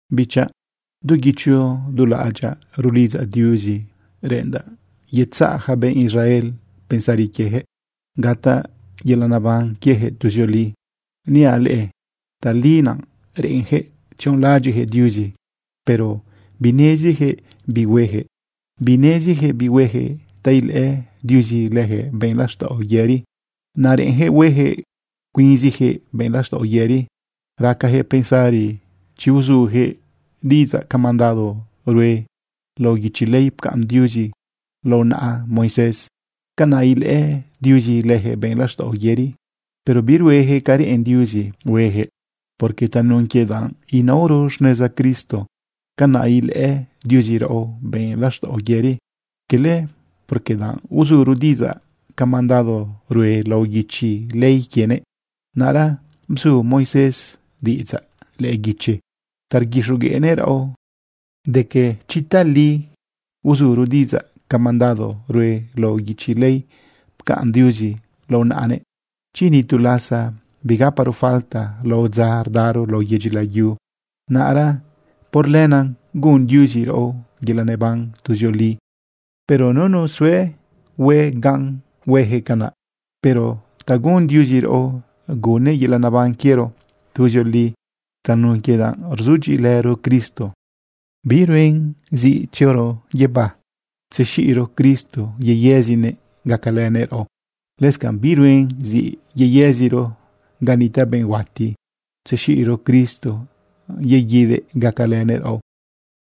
Bichaꞌ, du guicho du laꞌadyaꞌ rulidzaꞌ Diuzi reꞌendaꞌ yetzaꞌ yaca benꞌ Israel pensari quieyaquëꞌ gataꞌ yelaꞌ neban quiejëꞌ tuzioli. Niaꞌ leꞌe tali naꞌ reꞌenjëꞌ tzionlaꞌadyiꞌjëꞌ Diuzi, pero binezijëꞌ bi huejëꞌ. Binezijëꞌ bi huejëꞌ ta ilëꞌë Diuzi lëjëꞌ benꞌ laxtaꞌo yëri. Naꞌ reꞌenjëꞌ huejëꞌ cuinzijëꞌ benꞌ laxtaꞌo yëri. Racajëꞌ pensari chi uzujëꞌ diꞌidzaꞌ ca mandado rue lao guichi ley pcaꞌn Diuzi lao naꞌa Moisés, canaꞌ ilëꞌë Diuzi lëjëꞌ benꞌ laxtaꞌo yëri. Pero biruejëꞌ ca reꞌen Diuzi huejëꞌ, porque tanun quie danꞌ inaoro xneza Cristo, canaꞌ ilëꞌë Diuzi raꞌo benꞌ laxtaꞌo yëri, cala porque danꞌ uzuro diꞌidzaꞌ ca mandado rue lao guichi ley quienëꞌ. Naꞌra bzu Moisés diꞌidzaꞌ lëꞌë guichi ta rguixogueꞌnëꞌ raꞌo de quie chi tali uzuro diꞌidzaꞌca mandado rue lao guichi ley pcaꞌn Diuzi lao naꞌanëꞌ, chi ni tu lasa bigaparo falta lao dza rdaro lao yedyi layu, naꞌra por lenaꞌ gun Diuzi raꞌo yelaꞌ neban tuzioli. Pero nunu yezue hue gan huejëꞌ canaꞌ. Pero ta gun Diuzi raꞌo, gunnëꞌ yelaꞌ neban quiero tuzioli tanun quie danꞌ rzudyiꞌilëro Cristo. Biruen zi tzioro guibá tzexiꞌro Cristo yeyëzinëꞌ gacalënëꞌ raꞌo. Lëscanꞌ biruen zi yeyëziro ga nitaꞌ benꞌ huati tzexiꞌro Cristo yeguidëꞌ gacalënëꞌ raꞌo.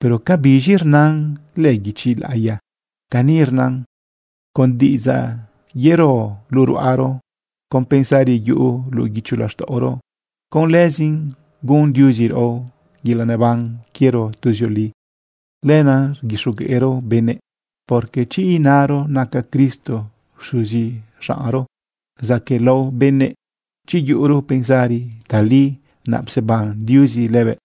Pero ¿ca biz̃i rnan lëꞌë guichi laꞌiya? Cani rnan: “Con diꞌidzaꞌ yero luꞌu ruꞌaro, con pensari yuꞌu luꞌu guicho laxtaꞌoro, con lëzin gun Diuzi raꞌo yelaꞌ neban quiero tuzioli.” Lenaꞌ rguixogueꞌro benëꞌ. Porque chi inaro naca Cristo xuzi xaꞌnro zaquëꞌlao lao benëꞌ, chi yuꞌuro pensari tali naꞌ pseban Diuzi lëbëꞌ,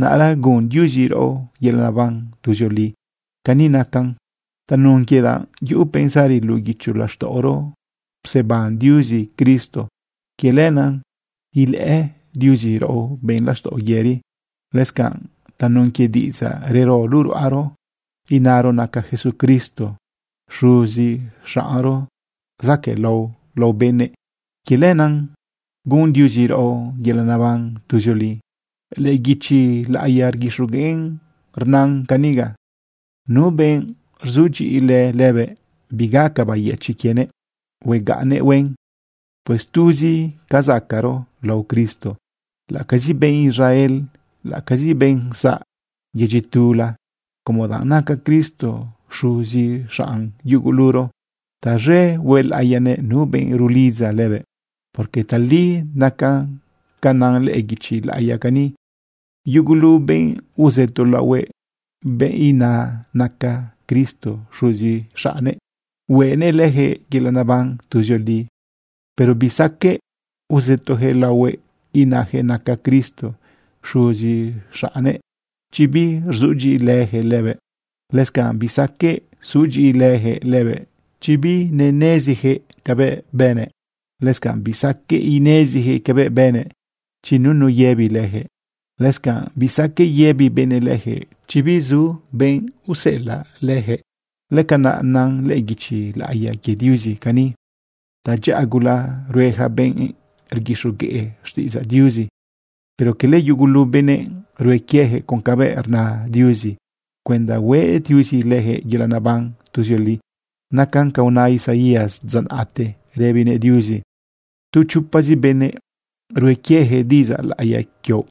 naꞌra gun Diuzi raꞌo yelaꞌ neban tuzioli. Cani nacan: Tanun quie danꞌ yuꞌu pensari luꞌu guicho laxtaꞌoro pseban Diuzi Cristo, quie lenaꞌ ilëꞌë Diuzi raꞌo benꞌ laxtaꞌo yëri. Lëscanꞌ tanun quie diꞌidzaꞌ rero luꞌu ruꞌaro inaro naca Jesucristo xuzi xaꞌnro zaquëꞌlao lao benëꞌ, quie lenaꞌ gun Diuzi raꞌo yelaꞌ neban tuzioli. Lëꞌë guichi laꞌiya rguixogueꞌn rnan caniga: “Nu benꞌ rzudyiꞌilë lëbëꞌ, bigaca bayëchiꞌ quienëꞌ huegaꞌnnëꞌ huen.” Pues tuzi ca zacaꞌro lao Cristo, laꞌ acazi benꞌ Israel, laꞌacazi benꞌ zaꞌ yedyi tula, como danꞌ naca Cristo xuzi xaꞌn yuguluro, taz̃e huelaꞌiyanëꞌ nu benꞌ rulidza lëbëꞌ. Porque tali nacan ca nan lëꞌë guichi laꞌiya cani: “Yugulu benꞌ uzëto laohuëꞌ, benꞌ ina naca Cristo xuzi xaꞌnnëꞌ, hueꞌnëꞌ leyaquëꞌ yelaꞌ neban tuzioli.” Pero bisaqueꞌ uzëtoyaquëꞌ laohuëꞌ inayaquëꞌ naca Cristo xuzi xaꞌnnëꞌ chi birzudyiꞌilëjëꞌ lëbëꞌ. Lëscanꞌ bisaqueꞌ sudyiꞌilëjëꞌ lëbëꞌ chi binenezijëꞌ cabëꞌ bënëꞌ. Lëscanꞌ bisaqueꞌ inezijëꞌ cabëꞌ bënëꞌ chi nunu yëbi leyaquëꞌ. Lëscanꞌ bisaqueꞌ yëbi benëꞌ leyaquëꞌ chi bizu benꞌ useꞌelaꞌ lëjëꞌ. Lëcanaꞌ nan lëꞌë guichi laꞌiya quie Diuzi cani: “Tadyaꞌa gula rue yaca benꞌ rguixogueꞌ xtiꞌidzaꞌ Diuzi.” Pero cala yugulu benëꞌ rue quieyaquëꞌ con cabë rna Diuzi cuenda hueꞌ Diuzi lëjëꞌ yelaꞌ neban tuzioli. Nacan ca una Isaías dza naꞌte rëbinëꞌ Diuzi: “Tu chopazi benëꞌ rue quieyaquëꞌ diꞌidzaꞌ laꞌiya quioꞌ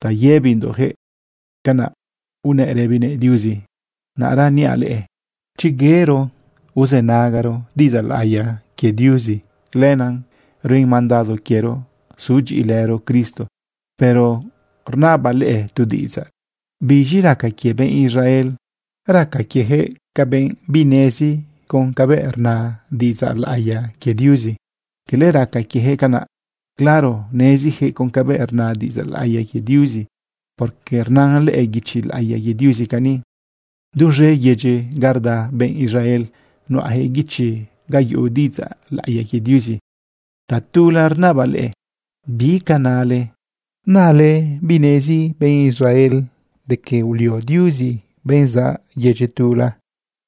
ta yëbindoꞌjëꞌ.” Canaꞌ unëꞌ rëbinëꞌ Diuzi. Naꞌra niaꞌ leꞌe, chi yero uzënagaro diꞌidzaꞌ laꞌiya quie Diuzi, lenaꞌ ruen mandado quiero sudyiꞌilëro Cristo. Pero rnabaꞌ leꞌe tu diꞌidzaꞌ: ¿Biz̃i raca quie benꞌ Israel? ¿Raca quiejëꞌ binezijëꞌ con cabëꞌ rna diꞌidzaꞌ laꞌiya quie Diuzi? Cala raca quiejëꞌ canaꞌ. Claro nezijëꞌ con cabëꞌ rna diꞌidzaꞌ laꞌiya quie Diuzi, porque rnan lëꞌë guichi laꞌiya quie Diuzi cani: Duz̃e yedyi ga rda benꞌ Israel nuꞌayaquëꞌ guichi ga yuꞌu diꞌidzaꞌ laꞌiya quie Diuzi. Tatula rnabaꞌ leꞌe: ¿Bi ca nale? ¿Nale binezi benꞌ Israel de que ulio Diuzi benꞌ zaꞌ yedyi tula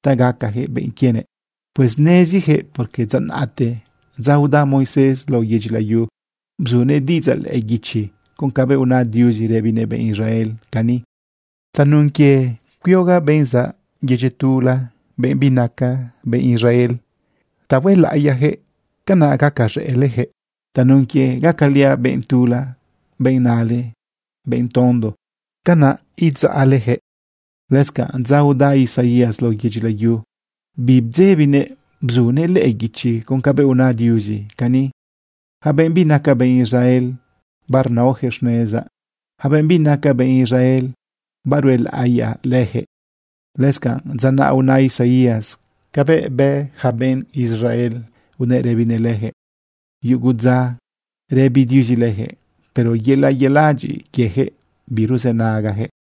ta gacayaquëꞌ benꞌ quienëꞌ? Pues nezijëꞌ, porque dza naꞌte, dza uda Moisés lao yedyi layu, bzunëꞌ diꞌidzaꞌ lëꞌë guichi con cabëꞌ una Diuzi rëbinëꞌ benꞌ Israel cani: Tanun quie cuiogaꞌ benꞌ zaꞌ yedyi tula, benꞌ binaca benꞌ Israel ta huelaꞌiyaꞌ leyaquëꞌ, canaꞌ gacaz̃ëꞌle leyaquëꞌ. Tanun quie gacaliaꞌ benꞌ tula, benꞌ nale benꞌ tondo, canaꞌ idzaꞌle leyaquëꞌ. Lëscanꞌ dza uda Isaías lao yedyi layu, bibdzebinëꞌ bzunëꞌ lëꞌë guichi con cabëꞌ una Diuzi cani: Yaca benꞌ binaca benꞌ Israel, barnaoyaquëꞌ xnezaꞌ. Yaca benꞌ binaca benꞌ Israel, baruelaꞌiyaꞌ leyaquëꞌ. Lëscanꞌ dza naꞌ una Isaías cabëꞌ bë ja benꞌ Israel unëꞌ rëbinëꞌ leyaquëꞌ: “Yugu dza rëbi Diuzi lëjëꞌ, pero yelaꞌ yeladyiꞌ quiejëꞌ biruzënagajëꞌ.”